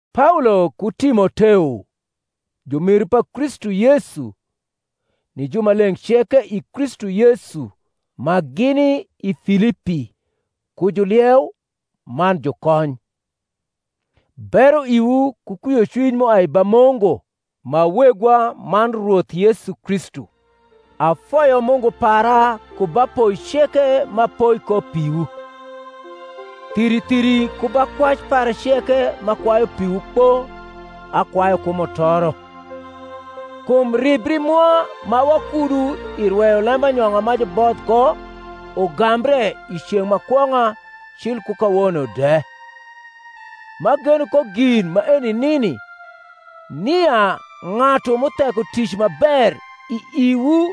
Paolo ku Timoteo, jumiru pa Kristu Yesu, ni jumaleng’ ceke i Kristu Yesu ma gini i Filipi, ku julieu man jukony: Bero iwu ku kwiocwiny m’uai ba Mungu ma Wegwa man Rwoth Yesu Kristu. Afoyo Mungu para ku ba poi ceke m’apoi ko piwu, thiri thiri ku ba kwac para ceke m’akwayu piwu kpo akwayu ku mutoro, kum ribri mwa ma wakudu i rweyo lembanyong’a ma juboth ko ugambre i ceng’ ma kwong’a cil ku kawono de; m’ageno ko gin maeni nini, nia ng’atu m’utheko tic ma ber i iwu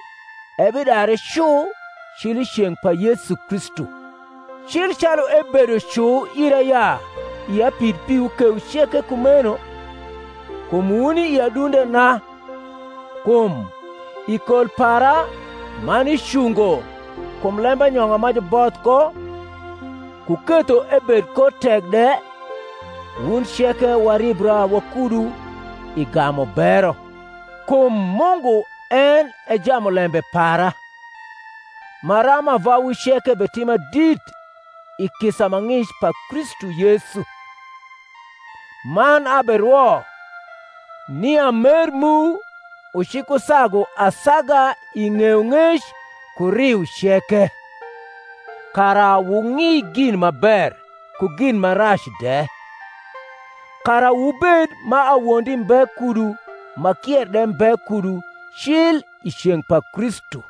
ebidare cu cil i ceng’ pa Yesu Kristu: cil calu ebedo cu ira ya ia pid piwu kewu ceke kumeno, kum wuni i adundena, kum, i kol para man i cungo kum lembanyong’a ma juboth ko ku ketho ebed ko tek de, wun ceke waribra wakudu i gamu bero. Kum Mungu en e jamulembe para, maram ava wu ceke betima dit i kisa ma ng’ic pa Kristu Yesu. Man aberwo, nia mer mu ucikusagu asaga i ng’eyong’ec ku riu ceke; kara wung’i gin ma ber ku gin ma rac de; kara wubed ma awondi mbe kudu ma kier de mbe kudu cil i ceng’ pa Kristu;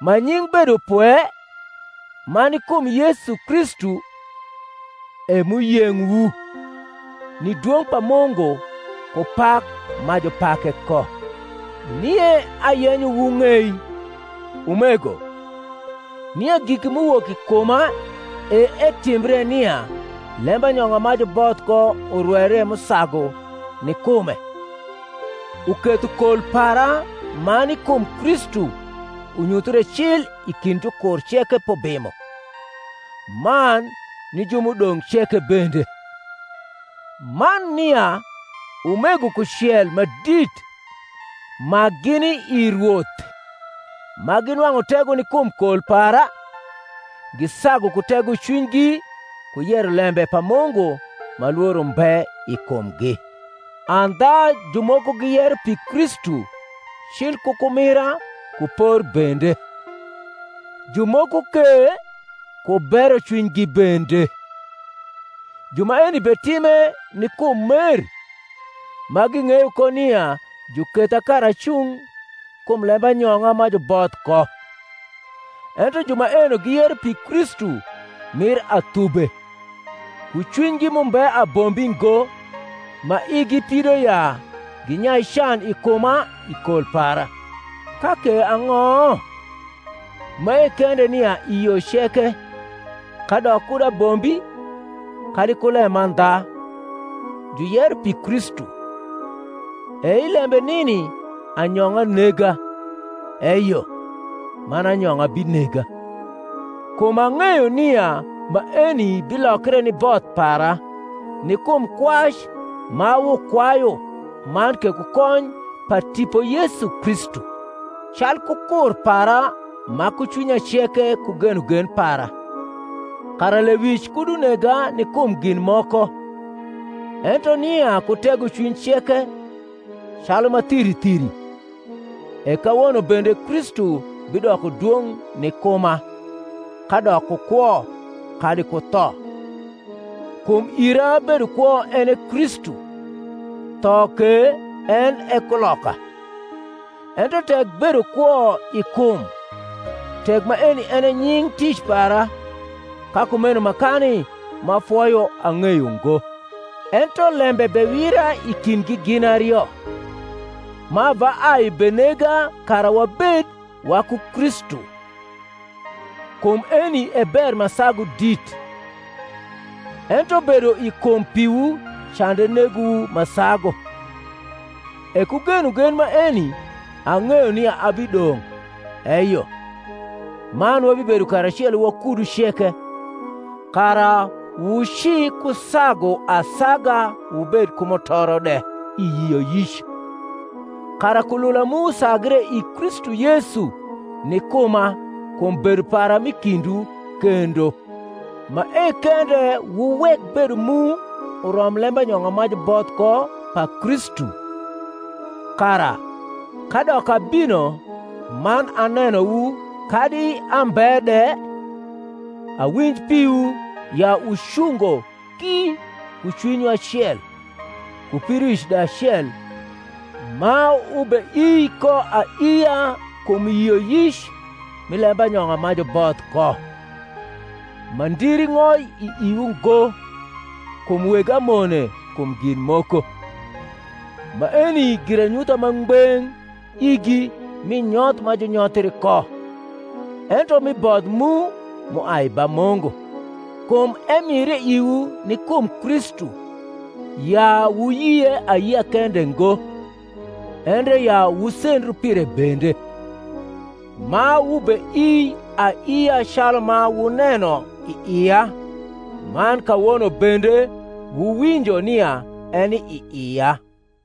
ma nying’ bedopwe, ma ni kum Yesu Kristu, e m’uyeng’wu, ni dwong’ pa Mungu ku pak ma jupake ko. Nie ayenyo wung’ei, umego, nia giki m’uwok i kuma e etimbre nia lembanyong’a ma juboth ko urweire m’usagu ni kume; uketho kol para ma ni kum Kristu unyuthre cil i kind jukur ceke p’ubimo, man ni ju m’udong’ ceke bende; man nia umego kucel ma dit ma gini i Rwoth, ma ginwang’u tego ni kum kol para, gisagu ku tegocwinygi ku yero lembe pa Mungu ma lworo mbe i kumgi. Andha jumoko giyero pi Kristu cil ku kumira ku por bende; jumoko ke ku berocwinygi bende: ju maeni betime ni kum mer, ma ging’eyo ko nia juketha kara acung kum lembanyong’a ma juboth ko: ento ju maeno giyero pi Kristu mir athube, ku cwinygi m’umbe abombi ngo, ma igi pido ya ginyai can i kuma i kol para. Ka ke ang’o? mae kende nia i yo ceke, kadok kud abombi kadi ku lemandha, juyero pi Kristu; e i lembe nini anyong’a nega, eyo, man anyong’a binega. Kum ang’eyo nia maeni bilokre ni both para, ni kum kwac ma wukwayu man ke ku kony pa Tipo Yesu Kristu, calku kur para ma ku cwinya ceke ku genogen para, kara lewic kud unega ni kum gin moko, ento nia ku tegocwiny ceke, calu ma thiri thiri, e kawono bende Kristu bidoko dwong’ ni kuma, kadok ku kwo, kadi ku tho. Kum ira bedo kwo en e Kristu, tho ke en e kuloka. Ento tek bedo kwo i kum, tek maeni en e nying’ tic para, ka kumeno makani m’afoyo ang’eyo ngo. Ento lembe bewira i kindgi gin ario, ma ava ai benega kara wabed waku Kristu; kum eni e ber ma sagu dit: ento bedo i kum piwu cande negowu ma sagu. E ku genogen maeni, ang’eyo nia abidong’, eyo, man wabibedo karacelo wakudu ceke, kara wucikusagu asaga wubed ku mutoro de i yioyic; kara kulula mu usagre i Kristu Yesu ni kuma kum bedo para m’i kindwu kendo. Mae kende wuwek bedo mu urom lembanyong’a ma juboth ko pa Kristu: kara, kadok abino man anenowu kadi ambe de, awinj piwu, ya wucungo ki ku cwinywu acel, ku pidoic de acel ma wubeii ko aiia kum yioyic mi lembanyong’a ma juboth ko; ma ndiri ng’oi i iwu ngo kum weg amone kum gin moko: maeni giranyutha ma ngbeng’ igi mi nyoth ma junyothri ko, ento mi both mu, m’uai ba Mungu; kum emire iwu ni kum Kristu, ya wuyie ayia kende ngo, endre ya wusendru pire bende: ma wubeii aiia calu ma wuneno i ia, man kawono bende wuwinjo nia eni i ia.